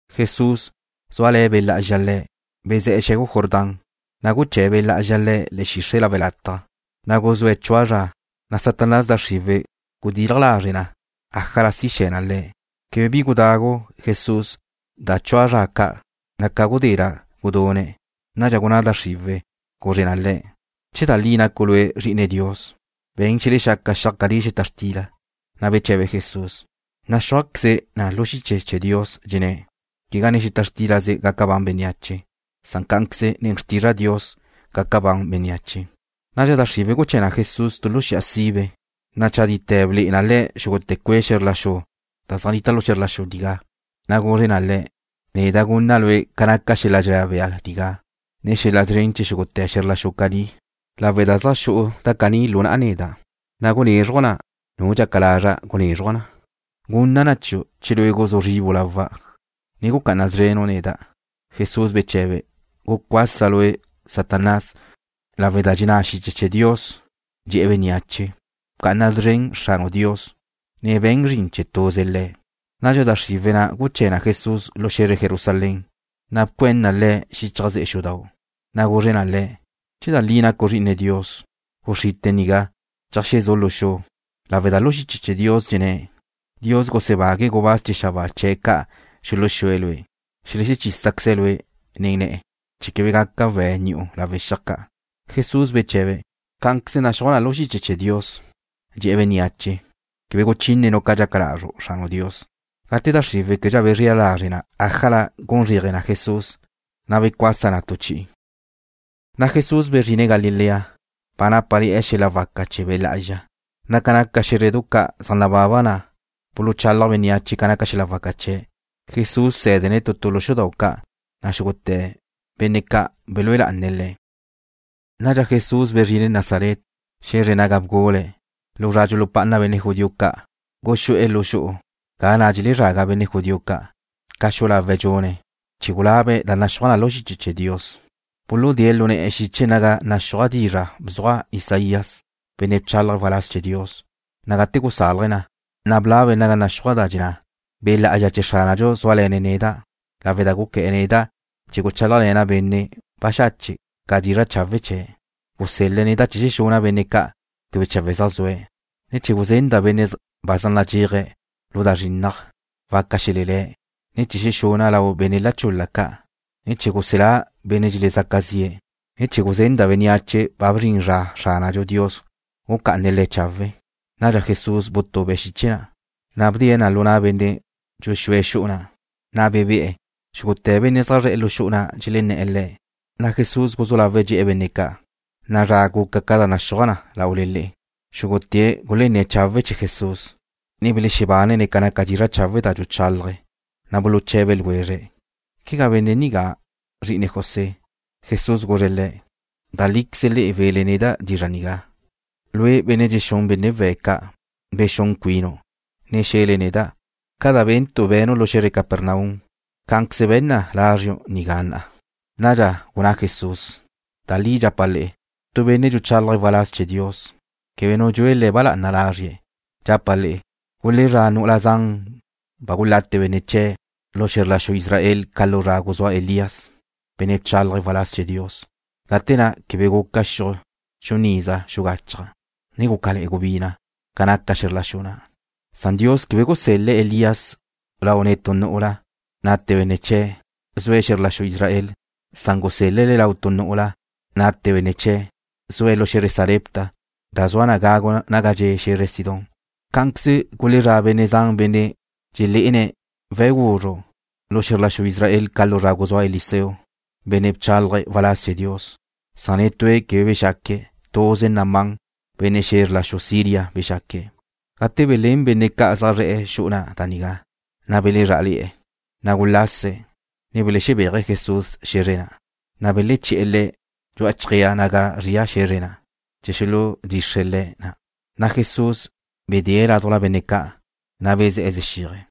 Jesús, zúale̱ Be' Lá'azxa Le̱', bezé̱'e̱ xe̱gu Jordán, na' guché̱ Be' Lá'azxa Le̱' le̱'e̱ xixre' lawe' lataj. Na' guzúe̱' chua zra, na' Satanás da xriwe̱' gudilaj lazre' na ájala si xe̱ na Le̱'. Quebe bi gudagu Jesús da chua zra ca', na' ca gudé na' gudune̱'. Nadxa gunná da xriwe̱', guzre na Le̱': ―Che da li nacu' Lue' Zri'ine Dios, be̱n xelexaca xiaj caní xeta xtila. Na' beche̱be Jesús: ―Naxúajqueze na lu xiche chee̱ Dios, dxenné̱': Quegá nen xeta xtílaze gaca ban bénneache, san cá'anqueze nen xrtizra' Dios gaca ban bénneache. Nadxa da xriwe̱' guché̱ na Jesús tu xi'a sibe, na' chadite̱ ble'e na Le̱' xúgute̱ cue' xe̱zr la xu da zaj nnita lu xe̱zr la xu nigá, na' guzre na Le̱': ―Neda' gunna' Lue' ca naca xel-la dxenná bea nigá, ne xel-la szren chee̱ xúgute̱ xe̱zr la xu caní, lawe' da zaj xu'u da caní lu na'a neda', na' gunézruja' na nu dxaca lazra' gunézruja' na. Gunna' na chiu' che lue' guzú zribu' lawa', ne gucá'ana szrenu' neda'. Jesús beche̱be̱': ―Gucuasa lue', Satanás, lawe' da dxenná xiche chee̱ Dios, dxe̱'e̱ bénneache: “Bca'ana szren Xranu' Dios, ne be̱n zrin chee̱ tuze Le̱'.” Nadxa da xriwe̱' na' guché̱ na Jesús lu xe̱zre Jerusalén, na' bcuén na Le̱' xichaj ze'e xudau', na' guzre na Le̱': ―Che da li na' nacu' Zri'ine Dios, guxrite' nigá cheajxe̱zu' lu xu, lawe' da lu xiche chee̱ Dios dxenné̱': Dios gusebague̱' gubáz chee̱ xabáa chee̱' ca' xuluxue̱' Lue'. Xelechísaqueze̱' Lue' nen ne̱'e̱, chee̱ quebe gaca we̱' ni'u lawe' xiaj ca'. Jesús beche̱be̱': ―Cá'anqueze naxúaj na lu xiche chee̱ Dios, dxe̱'e̱ bénneache: “Quebe guchínenu' ca dxaca lazru' Xranu' Dios.” Gate da xriwe̱' québedxa bezrela lazre' na ájala gun zréaje na Jesús, na' becuasa na tu chi'i. Na' Jesús bezrine̱' Galilea, ba nápale̱'e̱ xel-la waca chee̱ Be' Lá'azxa, na' ca naca xé̱zredu ca' zaj nababa na' buluchálaj bénneache ca naca xel-la waca chee̱'. Jesús bsé̱dene̱' benne' ca' tu tu lu xudau' ca', na' xúgute̱' belúe lá'ane̱' Le̱'. Nadxa Jesús bezrine̱' Nazaret, xe̱zre naga bgule̱'. Lu zra dxulupá'ana benne' judío ca' guxú'e̱ lu xu'u ga na' dxelezraga benne' judío ca', ca xu'u lawe̱' dxune̱', chee̱ gulabe̱' da naxúaj na lu xiche chee̱ Dios. Buludée̱' Lu ne̱'e̱ xiche naga naxúaj dizra' bzuaj Isaías, benne' bchálaje̱' waláz chee̱ Dios, na' gate gusálaje̱' na, na' blabe̱' naga naxúaj da dxenná: Be' Lá'azxa chee̱ Xránadxu zúale̱ne̱' neda', lawe' da guqué̱'e̱ neda' chee̱ guchálajle̱na' benne' baxache' ca' dizra' chawe' chee̱'. Gusel-le̱' neda' chee̱ xexuna' benne' ca' quebe chawe' zaj zue̱', ne chee̱ guzenda' benne' ba zaj nadxéaje̱' lu da zrinnaj, waca xelelé̱', ne chee̱ xexuna' lau benne' la chul-la ca', ne chee̱ guselá' benne' dxelezaca zi'e̱, ne chee̱ guzenda' bénneache ba bzrin zra Xránadxu Dios gucá'ane̱' le̱' chawe'. Nadxa Jesús butube̱' xiche na', na' bdee̱' na lu na' benne' dxuxúe̱' xu'u na', na' bebé'e̱. Xúgute̱ benne' zaj zre̱'e̱ lu xu'u na' dxelenné̱'e̱ Le̱', na' Jesús guzú lawe̱' dxe̱'e̱ benne' ca': ―Na'a zra guca ca da naxúaj na laule le'e. Xúgute̱' gulenné̱' chawe' chee̱ Jesús, ne belexebánene̱' ca naca dizra' chawe' da dxuchalaje̱'. Na' buluche̱be ljwezre̱': ―¿Quegá benne' nigá zri'ine José? Jesús guzre̱' le̱': ―Da líqueze le'e we̱le neda' dizra' nigá: Lue', benne' dxexúnu' benne' we̱' ca', bexún cuinu', ne xe̱le neda': Ca da bénentu' be̱nu' lu xe̱zre Capernaum, cá'anqueze be̱n na lázriu' nigá na'a. Nadxa gunná Jesús: ―Da li dxapa' le'e, tu benne' dxuchálaje̱' waláz chee̱ Dios, quebe nu dxue le̱' ba lá'ana lazrie̱'. Dxapa' le'e, gulezrá' nu'ula zan ba gulate benne' chee̱' lu xe̱zr la xu Israel ca lu zra guzúa Elías, benne' bchálaje̱' waláz chee̱ Dios, gate na' quebe guca xiuj chun iza xugachaj, ne gúcale̱'e̱ gubina' ca naca xe̱zr la xu na'. Dios quebe gusel-le̱' Elías lau netú nu'ula, nate benne' chee̱', zue̱' xe̱zr la xu Israel. Gusel-le̱' le̱' lau tu nu'ula, nate benne' chee̱', zue̱' lu xe̱zre Sarepta, da zua na gagu naga dxe' xe̱zre Sidón. Cá'anqueze gulezrá' benne' zan benne' dxeledxé'ene̱' we̱' guzru' lu xe̱zr la xu Israel ca lu zra guzúa Eliseo, benne' bchálaje̱' waláz chee̱ Dios, na' netúe̱' quebe bexaque̱'. Tuze Naamán, benne' xe̱zr la xu Siria bexaque̱'. Gate belén benne' ca' zaj zre̱'e̱ xu'u na' da nigá, na' belezrá'ale̱'e̱. Na' gulase̱', ne belexebéaje̱' Jesús xe̱zre na', na' beleché̱'e̱ Le̱' dxu'a chjéaj naga zria xe̱zre na', chee̱ xuludxixre̱' Le̱' na'. Na' Jesús bedée̱' ládujla benne' ca', na' bezé̱'e̱ zexíaje̱'.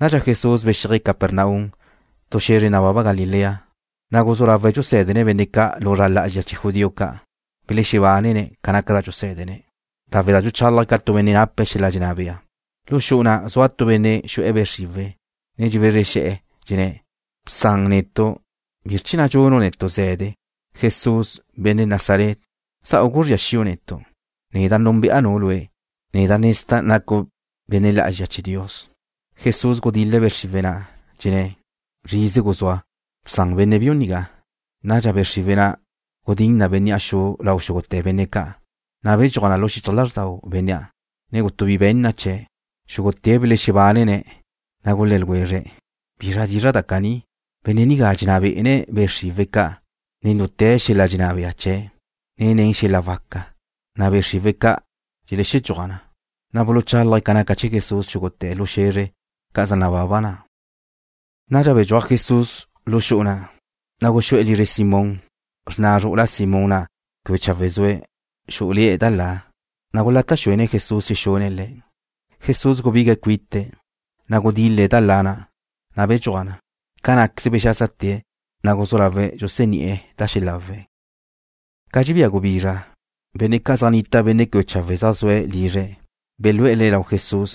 Nadxa Jesús bexíaje̱' Capernaum, tu xe̱zre nababa Galilea, na' guzú lawe̱' dxusé̱dene̱' benne' ca' lu zra lá'azxa chee̱ judío ca'. Belexebánene̱' ca naca da dxusé̱dene̱', lawe' da dxuchálaje̱' ca tu benne' nape̱' xel-la dxenná bea. Lu xu'u na' zua tu benne' xu'e̱ be' xriwe̱', na' dxebezre xe̱'e̱, dxenné̱': ―Bsan netu'. ¿Bizr chee̱ na' dxunu' netu' ze̱de, Jesús, benne' Nazaret? ¿Za'u guzría xi'u netu'? Neda' núnbe'a Lue', ne nezda' nacu' benne' lá'azxa chee̱ Dios. Jesús gudil-le̱' be' xriwe̱' na', dxenné̱': ―Zrize guzúa. Bsan benne' biu nigá. Nadxa be' xriwe̱' na' gudín na bénnea' xu lau xúgute̱ benne' ca', na' bedxúaj na lu xichaj lázrdau bénnea', ne quebe bi be̱n na chee̱'. Xúgute̱' belexebánene̱', na' gulé̱' ljwezre̱': ―¿Bizra dizra' da caní? Benne' nigá dxenná bé'ene̱' be' xriwe̱' ca' nen dute̱ xel-la dxenná bea chee̱', ne nen xel-la waca, na' be' xriwe̱' ca' dxeledxúaj na. Na' buluchálaje̱' ca naca chee̱ Jesús xúgute̱ lu xe̱zre ca' zaj nababa na'. Nadxa bedxúaj Jesús lu xu'u na', na' guxú'e̱ lizre Simón. Xrna zru'ula Simón na' quebe chawe' zue̱', xú'ule̱'e̱ da la, na' gulata' xuene̱' Jesús xexune̱' le̱'. Jesús gubigue̱'e̱ cuite̱', na' gudil-le̱' da la na', na' bedxúaj na. Ca ná'queze bexásate̱', na' guzú lawe̱' dxuseni'e̱ da xelawe̱'. Ca dxebía gubizra, benne' ca' zaj nnita' benne' quebe chawe' zaj zue̱' lizre̱' belú'e̱ le̱' lau Jesús,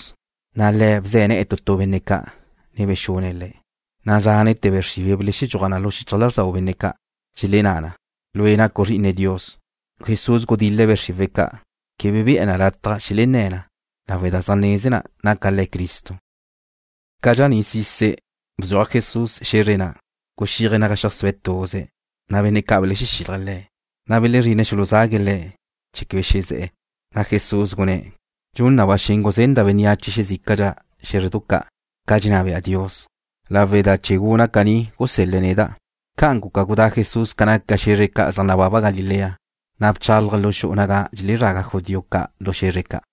na' Le̱' bze̱ ne̱'e̱ tu tu benne' ca', ne bexune̱' le̱'. Cá'anqueze zánete̱ be' xriwe̱' belexedxúaj na lu xichaj lázrdau benne' ca'. Dxelenná na: ―Lue' nacu' Zri'ine Dios. Jesús gudil-le̱' be' xriwe̱' ca'. Quebe be̱'e̱ na lataj xelenné̱ na, lawe' da zaj neze na naca Le̱' Cristo. Ca dxaní'sise̱', bdxuaj Jesús xe̱zre na', guxíaje̱' naga xeajsúe̱' tuze̱'. Na' benne' ca' belexexílaje̱' Le̱', na' belezrine̱' xuluzague̱' Le̱' chee̱ quebe xeze̱'e̱. Jesús gunné̱': ―Dxun na ba xen guzenda' bénneache xezícadxa xe̱zrdu ca' ca dxenná bea Dios, lawe' da chee̱ guna' caní gusel-le̱' neda'. Ca'an guca gudá Jesús ca naca xe̱zre ca' zaj nababa Galilea, na' bchálaje̱' lu xu'u naga dxelezraga judío ca' lu xe̱zre ca'.